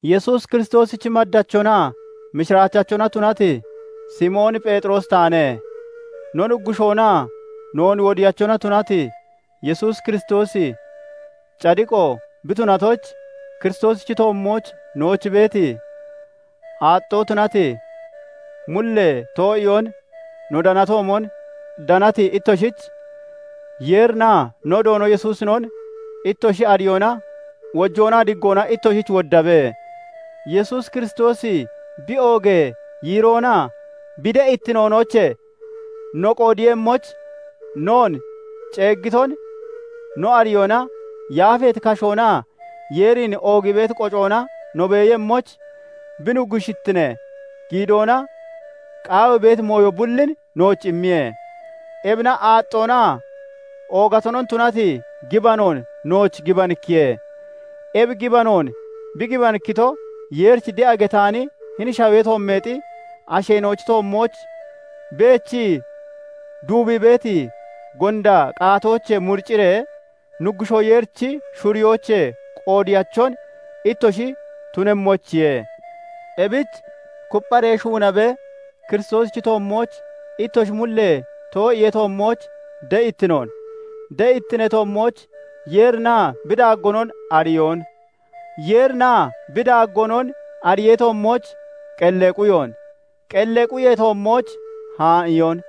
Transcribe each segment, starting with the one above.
Yesuus Kiristoosichi maddachonaa mishiraachachona tunati Simoon Pheexiroosi taane. No Nuggushoonaa noon Wodiyachona tunati Yesuus Kiristoosi cadiqo bi tunatoyich, Kiristoosichi toommooch nooch beeti, aaxxoo tunati mullee too'iyoon no danatoomon danati ittoshich; Yeerinaa no Doono Yesuusinon ittoshi ariyoona wojoonaa diggoona ittoshich woddabe. Yesuus Kiristoosi bi oogee yiiroonaa bi de'ittinoonoochee no qoodeeyemmoyich, noon ceeggiton no ariyoona yaafeeti kashoonaa Yeerin oogii beeti qocoona no beeyemmoyich bi nuggushittinee giidoona qaawii beeti mooyo bullin nooch immiye. Ebina aaxxoonaa oogatonon tunati gibanoon nooch gibanikkiye; ebi gibanoon bi gibanikkito, Yeerich de'a getaani hini shawee toommeexi asheena'ochi toommooch beechii, duubii beeti gonda qaatoochee muriciree Nuggushoo Yeerichi shuriyoochee qoodeyachon ittoshi tunemmoyichiye. Ebich kuppharee shuunabee Kiristoosichi toommooch ittoshi mullee too'iyee toommooch de'ittinoon, de'ittinee toommooch Yeerinaa bi daaggoonon ariyoon, Yeerinaa bi daaggoonon ariyee toommooch qellee quyoon, qellee quyee toommooch haa'iyoon,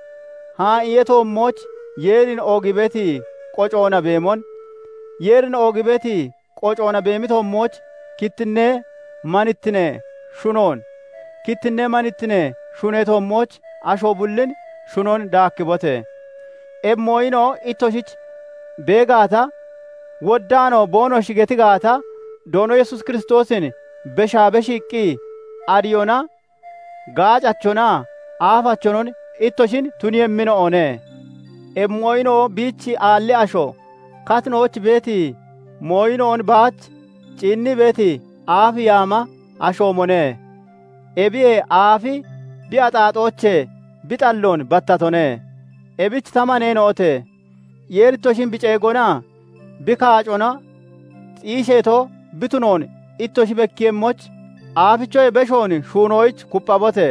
haa'iyee toommooch Yeerin oogii beeti qocoona beemon, Yeerin oogii beeti qocoona beemi toommooch kittinnee manittinee shunoon, kittinnee manittinee shunee toommooch asho bullin shunon daakkibote! Ebi mooyina'o ittoshich bee gaata, woddaanoo boonoshi geti gaata, Doono Yesuus Kiristoosin beshaa beshiiqqi ariyoona gaacachonaa aafachonon ittoshin tuniiyemmina'one; ebi mooyina'o biich aalli asho, katinooch beeti mooyina'on baach ciinnii beeti aaf yaama ashoomone; ebiyee aafi bi axaaxoochee bi xalloon battatone. Ebich ta maneena'ote! Yeeri ittoshin bi ceegonaa bi kaacona xiisheeto bi tunoon ittoshi bekkiiyemmoyich, aafichoyee beshoon shuunoyich kupphabote!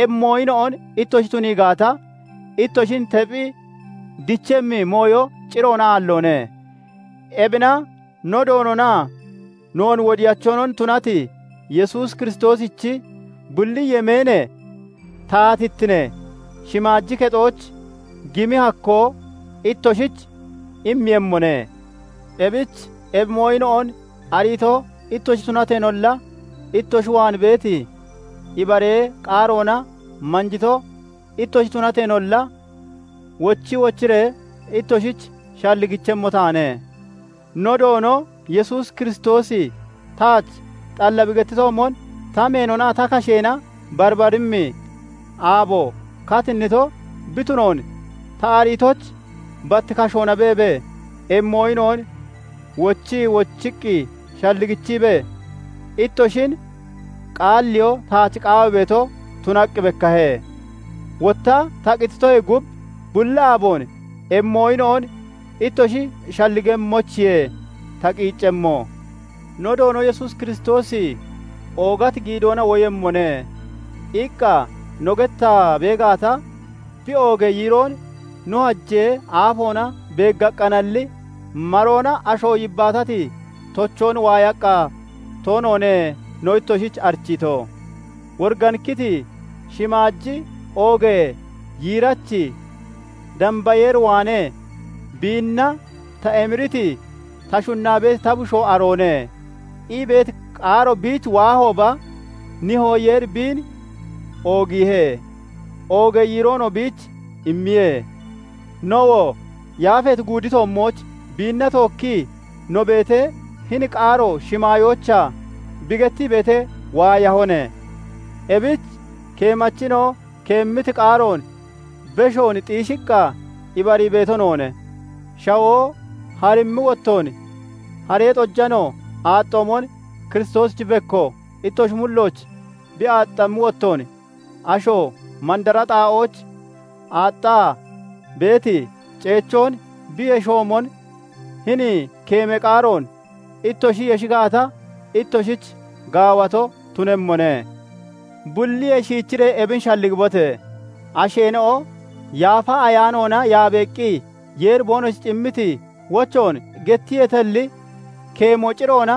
Ebi mooyina'on ittoshi tunii gaata, ittoshin tephi dichemmi mooyo ciroona aalloone. Ebina no Doononaa noon Wodiyachonon tunati Yesuus Kiristoosichi bulli yemeenee taatittinee shimaaji kexooch gimi hakkoo ittoshich immeeyemmone. Ebich ebi mooyina'on ariito ittoshi tunateenolla, ittoshi waan beeti ibaree qaaroona manjito ittoshi tunateenolla, wochi wochiree ittoshich shalligichemmo taane. No Doono Yesuus Kiristoosi taach xalla bi gettitoomon, ta meenonaa ta kasheena barbaremmi aabo katinnito bi tunoon ta ariitoyich, bat kashoona beebee ebi mooyina'on wochii wochiqqi shalligichiibee ittoshin qaalliyoo taach qaawii beeto tunaqqi bekkahe. Wotta ta qititoyee gub, bulli aaboon ebi mooyina'on ittoshi shalligemmoyichiye ta qiiccemmo. "No Doono Yesuus Kiristoosi oogati giidoona woyemmone" iqqa no gettaa bee gaata, bi oogee yiiroon no hajee aafoona beeggaqqaanalli, maroona asho yibbaatati tochoon waayaqqa toonoone no ittoshich arichiito. Woriganikkiti shimaaji oogee yiirachi, damba Yeer waanee "Biinna ta emiriti, ta shunnaa beeti ta Bushoo aroone" ii beeti qaaro biich waahooba, Nihoo Yeeri biin oogiihe; oogee yiiroonoo biich immiye; nowoo yaafeeti guudi toommooch biinna tookkii no beetee, hini qaaro shimaayoochaa bi gettii beetee waayahone. Ebich keemachina'o keemmiti qaaroon beshoon xiishiqqa ibarii beeto noone; shawoo harimmi wottoon haree xojano aaxxoomon Kiristoosichi bekko ittoshi mullooch bi aaxxammi wottoon, asho mandara xaa'ooch aaxxaa beeti ceechoon bi yeshoomon hini keemee qaaroon ittoshi yeshi gaata, ittoshich gaawato tunemmone. Bulliyee shiichiree ebin shalligibote! Asheena'o Yaafa Ayaanoona yaabeeqqi Yeeri boonoshich immiti wochoon gettiyeetalli, keemo ciroona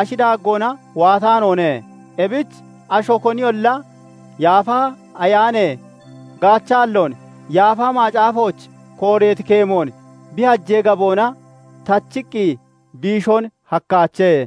ashi daaggoona waataanoone; ebich asho koniyolla Yaafa Ayaanee gaachaalloon, Yaafa Macaafooch kooreeti keemoon bi hajee gaboona tachiqqi biishoon hakkaache.